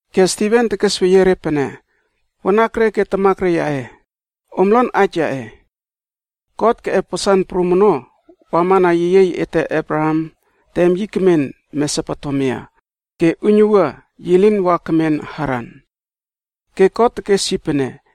Ke Stiven tekesweyie re pene, “Wanakre ke tamakre yaꞌe, om lon aij yaꞌe! God keꞌep wasan prum ono wamana yeyiey ete Abraham tem yi kemen Mesopotemia ke uiynuwua yi lin wa kemen Haran. Ke God tekes yi pene,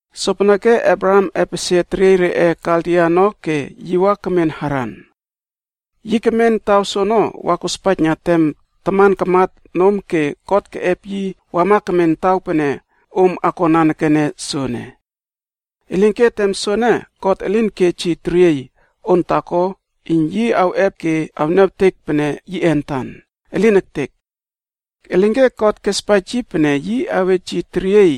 “Sopeneke Abraham epesie teriey reꞌe Kaldia ono ke yi wa kemen Haran. Yi kemen taw soono wa kospaijna tem taman kamat nom ke God keꞌep yi wama kemen taw pene om akon nanekene soene. Elinke tem soene God elin kej yi teriey on taako iyn yi awꞌep ke awniawtek pene yiꞌe antan. Elin ektek! Elinke God kespaij yi pene yi awej yi teriey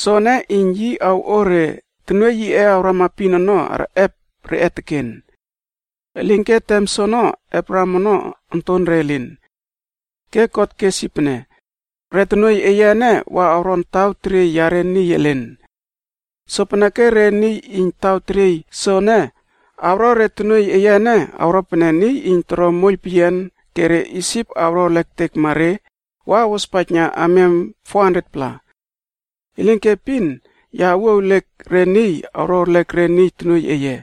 soene iyn yi awꞌo re tonuoiy yiꞌe awrama epin ono, arꞌep reꞌe teken. Elinke tem soono Abraham ono ontonre elin. Ke God kes yi pene, ‘Re tonuoiy eye ene wa awron taw teriey yare niy elen. Sopeneke re niy iyn taw teriey soene awro re tonuoiy eye ene, awro pene niy iyn toro moiyl peyian ke re Isip awro erlek ektekma re wa awospaijna amiam 400-pla. God kes pene, ‘Ya awuo ewliek re niy awro erlek re tonuoiy eye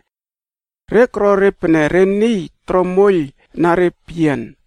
iyn awro re awron pene niy iyn toro re moiyl peyian ono.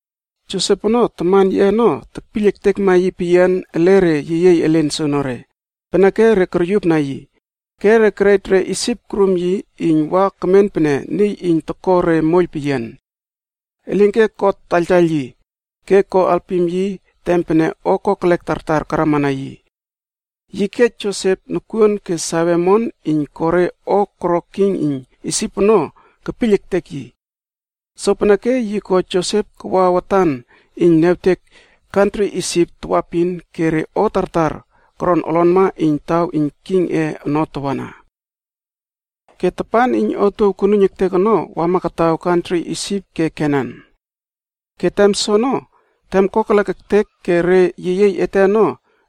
“Josep ono, taman yiꞌe ono tekpiyl ektekma yi peyian ele re yeyiey elen soonore, peneke re koryupna yi, ke re kerej re Isip korum yi iyn wa kemen pene niy iyn toko re moiyl peyian. Elinke God taiyltaiyl yi, ke ko alpim yi tem pene o kokelek tartar karamana yi. Yi kej Josep nokuon ke save omon iyn ko re o koro king iyn Isip ono kepiyl ektek yi. Sopeneke yi ko Josep kawa watan iyn niawtek kantri Isip tawaepin ke re o tartar koron olonma iyn taw iyn kingꞌe ono tawana. “Ke tapan iyn otuow konuiyn ektek ono wama kataw kantri Isip ke Kenan. Ke tem soono, tem kokelek ektek ke re yeyiey ete ono,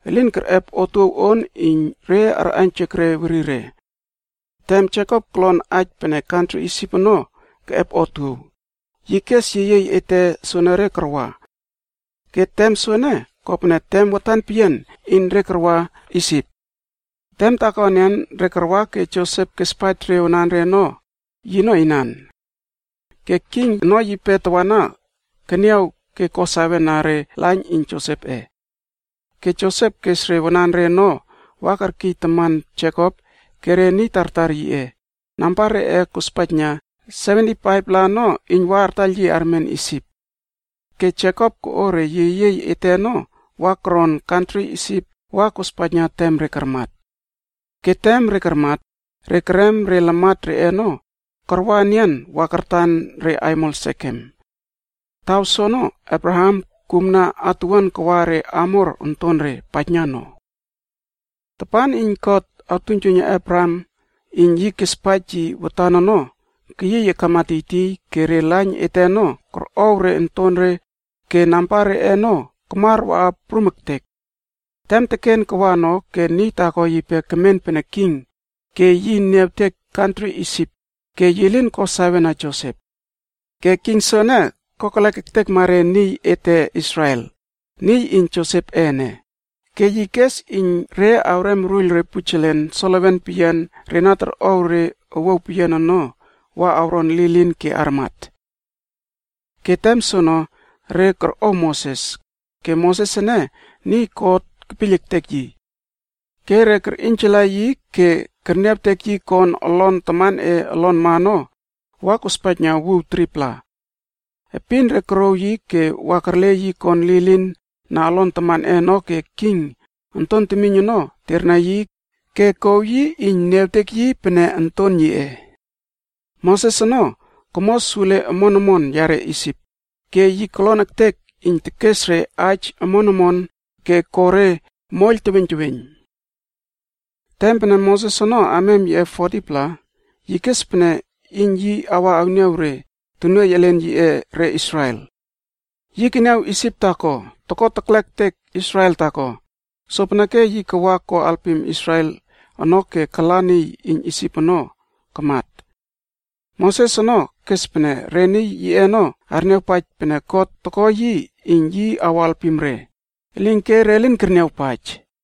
elin kerꞌep otuow on iyn re arꞌaiynjek re werire. Tem Jekop kolon aij pene kantri Isip ono keꞌep otuow, yi kes yeyiey ete soenere karwa. Ke tem soene, kopene tem watan peyian iyn re karwa Isip. Tem taako enian, re karwa ke Josep kespaij re wananre ono, yino inan. Ke king ono yipe tawana keniaw ko sawena re lain iyn Josepꞌe. Ke Josep kes re wananre ono wa kerkiy taman Jekop ke re niy tartar yiꞌe, namba reꞌe kospaijna 75-pla ono iyn wa artaiyl yi armen Isip. Ke Jekop koꞌo re yeyiey ete ono wa koron kantri Isip wa kospaijna tem re karmat. Ke tem re karmat, re kerem re lamat reꞌe ono karwa enian wa kartan re aimol Sekem. Taw soono Abraham kumna atuwuan kawa re Hamor ontonre paijna no. “Tapan iyn God awtuiynjuiyna Abraham aij yi kespaij yi watan ono keyiy akama tiytiy ke re lain ete ono korꞌow re ontore ke namba reꞌe ono kamar waꞌa prum ektek. Tem teken kawa ono ke niy taako yipe kemen pene king ke yi niawtek kantri Isip ke yi lin ko sawena Josep. Ke king soene, kokelek ektekma re niy ete Israel ke yi kes re iyn re awrem awruiyl re pujelen solewen peyian re na torꞌow re owuaw peyian ono wa awron lilin ke armat. “Ke tem soono re korꞌow Moses, ke Moses ene niy God kepiyl ektek yi. Ke re kerꞌiynjala yi ke kerniawtek yi kon olon tamanꞌe olonma ono wa kospaijna wuw 3-pla. Epin re korouw yi ke wa kerle yi kon lilin na olon tamanꞌe ono ke king onton temiyn ono terna yi ke kouw yi iyn niawtek yi pene onton yiꞌe. Moses ono komo sule omon omon yare Isip, ke yi kolon ektek iyn tekes re aij omon omon ke ko re moiyl teweiyn teweiyn. “Tem pene Moses ono amiam yiꞌe 40-pla, yi kes pene iyn yi awa awniaw re tonuoiy elen yiꞌe re Israel. Yi keniaw Isip taako toko teklek ektek Israel taako, sopeneke yi kawa ko alpim Israel ono ke kala niy iyn Isip soono kamat. Moses ono kes pene re tonuoiy elen yiꞌe ono arniawpaij pene God toko yi iyn yi awo alpim re, elinke re lin kerniawpaij.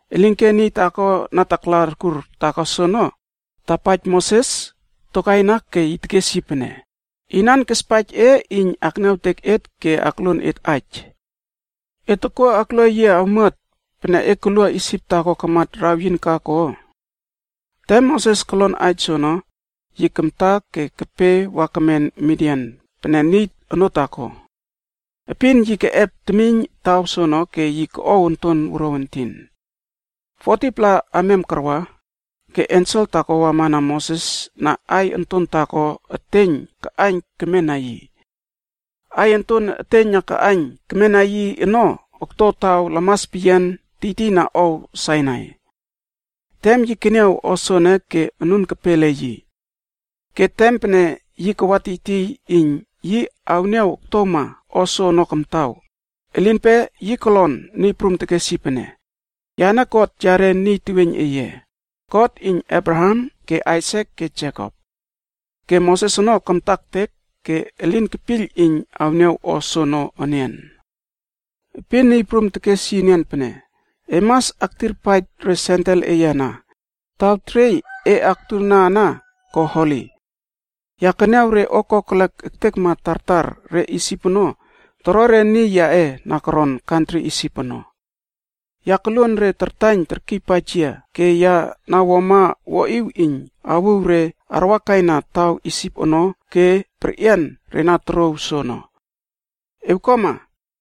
“Elinke niy taako na takla arkur taako soono tapaij Moses tokaina ke tekes yi pene, ‘Inan kespaij e iyn akniawtek et ke akluon et aij. E tokuo aklua yia awmuat pene e kalua Isip taako kamat raweyin ka ko?’c Tem Moses kolon aij soono, yi kamta ke kepe wa kemen Midian pene niy onoo taako. Epin yi keꞌep temiyn taw soono ke yi koꞌow onton wuruaw entin. “40-pla amiam karwa, ke ensel taako wama na Moses na aiy onton taako eteiyn kaꞌaiyn kemena yi. Aiy onton eteiyn na kaꞌaiyn kemena yi ono okto taw lamas peyian re niy elin toron tiytiyna ow Sainai. Tem yi keniaw o soene ke anun kepe ele yi. Ke tem pene yi kawa tiytiyna iyn yi awniaw oktowma o soono kamtaw, elinpe yi kolon Niy Prum tekes yi pene, ‘Yane God yare niy teweiyn eye, God iyn Abraham ke Aisak ke Jekop.’d Ke Moses ono kamta ektek ke elin kepiyl iyn awniaw o soono enian. “Epin Niy Prum tekes yi enian pene, ‘E mas aktirpaij re sendel eye ana, taw teriey e aktuna ana ko Holi. Ya keniaw re o kokelek ektekma tartar re Isip ono toro re niy yaꞌe na koron kantri Isip ono. Ya koluon re tartaiyn terkiypaij yia ke ya na wuama wuaꞌiw iyn awuw re arwakaina taw Isip ono ke perꞌian re na torouw soono. Ewkuama,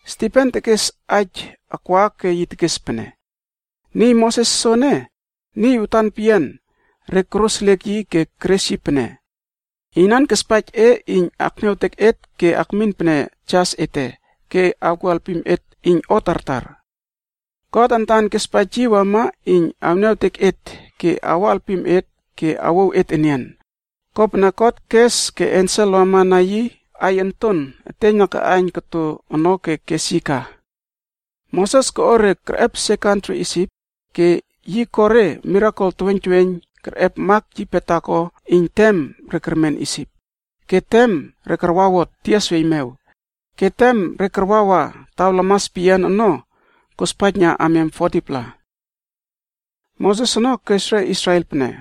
Stiven tekes aij akwa ke yi tekes pene, “Niy Moses soene, niy watan peyian re koroseliek yi ke keres yi pene, ‘Inan kespaij e iyn akniawtek et ke akmin pene jas ete ke awkuo alpim et iyn o tartar?’ God antan kespaij yi wama iyn awniawtek et ke awo alpim et ke awouw et enian, kopene God kes ke ensel wamana yi aiy onton eteiyn na kaꞌaiyn koto ono ke kes yi ka. Moses koꞌo re kerꞌepesie kantri Isip ke yi ko re mirakel teweiyn teweiyn kerꞌep mak yipe taako iyn tem re kermen Isip, ke tem re karwawot Tias Weimew, ke tem re karwawa taw lamas peyian re niy elin toron ono kospaijna amiam 40-pla. “Moses ono kes re Israel pene,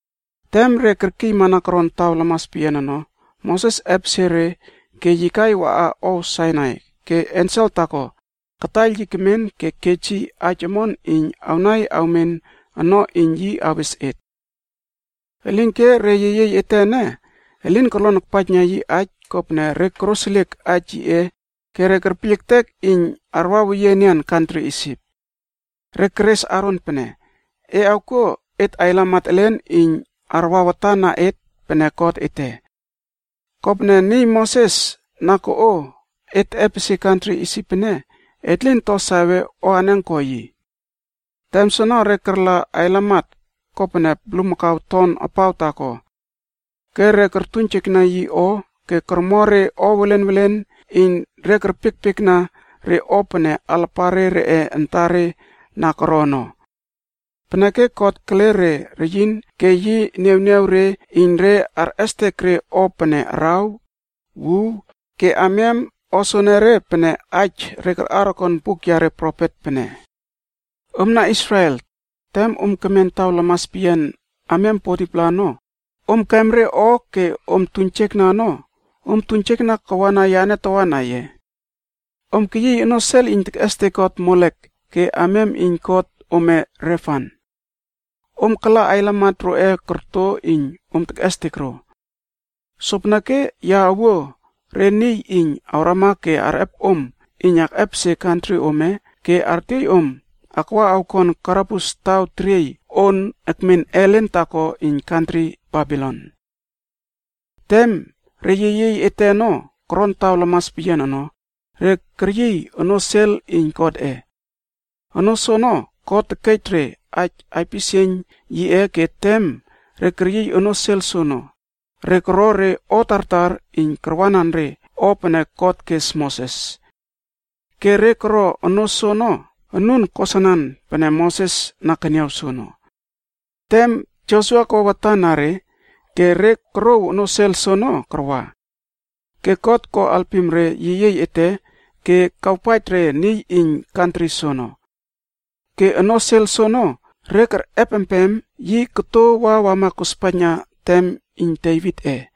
Tem re kerkiymana koron taw lamas peyian re niy elen toron ono, Moses epesie re ke yi kai waꞌa ow Sainai ke ensel taako kataiyl yi kemen ke kej yi aij omon iyn awnai awmen ono iyn yi awes et. “Elinke re yeyiey ete ene, elin korlonpaijna yi aij kopene re koroseliek aij yiꞌe ke kerpiyl ektek iyn arwaweyie enian kantri Isip. Re keres Aron pene, ‘E awkuo et ailamat elen iyn arwa watan na et pene god ete. Kopene niy Moses na koꞌo et teꞌepesie kantri Isip ke na tama aton taw soene, Tem soono re karla ailamat kopene bulmakau ton apaw taako. Ke re kortuiynjekna yi o ke kormo re o welen welen iyn re kerpiekpiekna re o pene alapare reꞌe antare na koro ono. Peneke God kele re reyin ke yi niawniaw re iyn re arꞌestek re o pene araw, wuw ke amiam o soenere pene aij re karꞌar okon buk yare profet pene, ‘Omna Israel! Tem om kemen taw lamas peyian amiam 40-pla ono, om kem re o ke om tuiynjekna ono, om tuiynjekna wama yane tawana ye? Om keyiy onoo sel iyn tekꞌestek god Molekh ke amiam iyn god ome Refan. Om kala ailamat roꞌe korto iyn om tekꞌestek ro. Sopeneke ya awuo re niy iyn awrama ke arꞌep om iyn akꞌepesie kantri ome ke artiey om akwa awkon karabus taw teriey on ekmen ellen taako iyn kantri Babilon.’i “Tem re yeyiey ete ono koron taw lamas peyian ono, re keryiy onoo sel iyn Godꞌe. Onoo soono God tekej re aij aipisieiyn yiꞌe ke tem re keryiy onoo sel soono, re koro re o tartar iyn karwanan re o pene God kes Moses. Ke re koro onoo ono anun kosanan pene Moses na keniaw soono. Tem Josua kawa watan na re, ke re korouw onoo sel soono karwa. Ke God ko alpim re yeyiey ete ke kawpaij re niy iyn kantri soono. Ke onoo sel soono re kerꞌepempem yi koto wa wama kospaijna tem iyn Devitꞌe.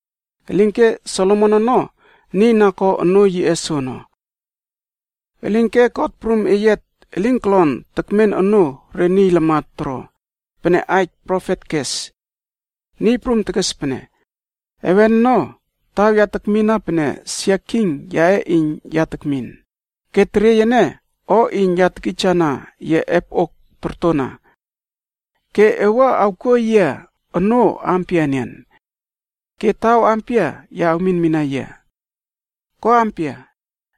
Elinke Solomon ono niy na ko onoo yiꞌe soono. “Elinke God Prum Eyiat elin kolon tekmen onoo re niy lamat toro, pene aij profet kes. ‘Niy Prum tekes pene, “Heven ono taw ya tekmina pene sia king yaꞌe iyn ya tekmin, ke teriey ene o iyn ya tekijana yia epoꞌok tortona. Ke e wua awkuo yia onoo ampia enian? Ke taw pia ya awminmina yia? Ko ampia,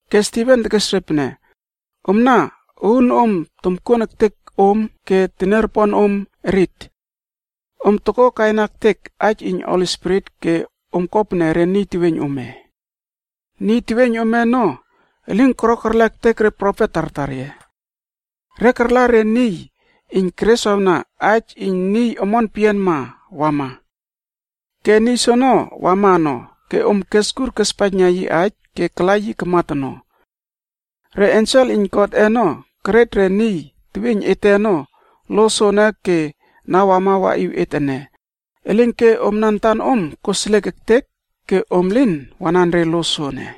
Ke Stiven tekes re pene, “Omna uunom tomkuon ektek om ke teniaroponom erit. Om tokokaina ektek aij iyn Holi Spirit ke om ko pene re niy teweiyn ome. Niy teweiyn ome ono elin koro kerlek ektek profet tartar ye? Re karla re niy iyn kereswawna aij iyn Niy Omon Peyianma awama. Ke niy soono wama ono ke om keskur kespaijna yi aij ke kala yi kamat ono. Re ensel iyn Godꞌe ono kerej re niy teweiyn ete ono lo soene ke na wama waꞌiw et ene, elinke omna antanom koseliek ektek ke om lin wanan re lo soene.”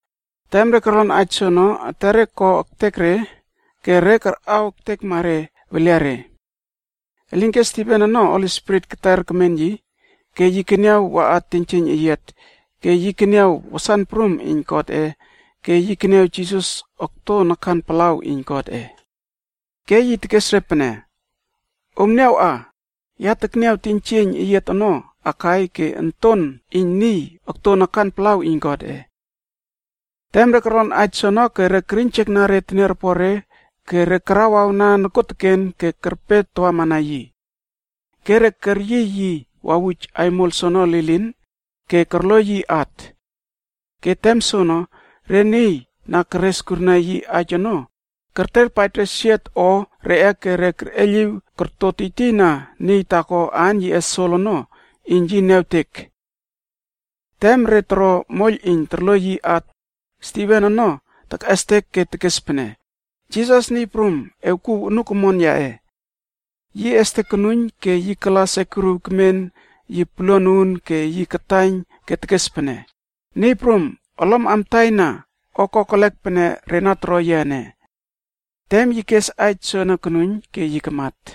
Tem re korlon aij soono, etere ko ektek re ke re karꞌaw ektekma re weliare. Elinke Stiven ono Holi Spirit keter kemen yi ke yi keniaw waꞌa teiynjieiyn eyiat ke yi keniaw wasan prum iyn Godꞌe ke yi keniaw Jisas okto nakan palaw iyn Godꞌe. Ke yi tekes re pene, “Om niawꞌa, ya tekniaw teiynjieiyn eyiat ono akai ke Onton iyn Niy okto nakan palaw iyn Godꞌe.” Tem re korlon aij soono ke re keriynjekna re teniaropore ke karawawna nokuoteken ke kerpe tawamana yi. Ke re keryiy yi wawuj aimol soono lilin ke korloiy yi at. Ke tem soono, re niy na kereswawna aij kiskurna, kerterpaij re siot o reꞌe ke kerꞌeiyliw korto tiytiyna niy taako aan yiꞌe Sol ono iyn yi awniawtek. Tem re toro moiyl iyn torloiy yi at, Stiven ono tekꞌestek ke tekes pene, “Jisas, Niy Prum, ewkuw anuk omon yaꞌe.” Yi estek konuiyn ke yi kala sekuriw kemen yi poluan uun ke yi kataiyn ke tekes pene, “Niy prum, olom amtaina o kokelek pene re na toro yia ene.” Tem yi kes aij soene konuiyn ke yi kamat.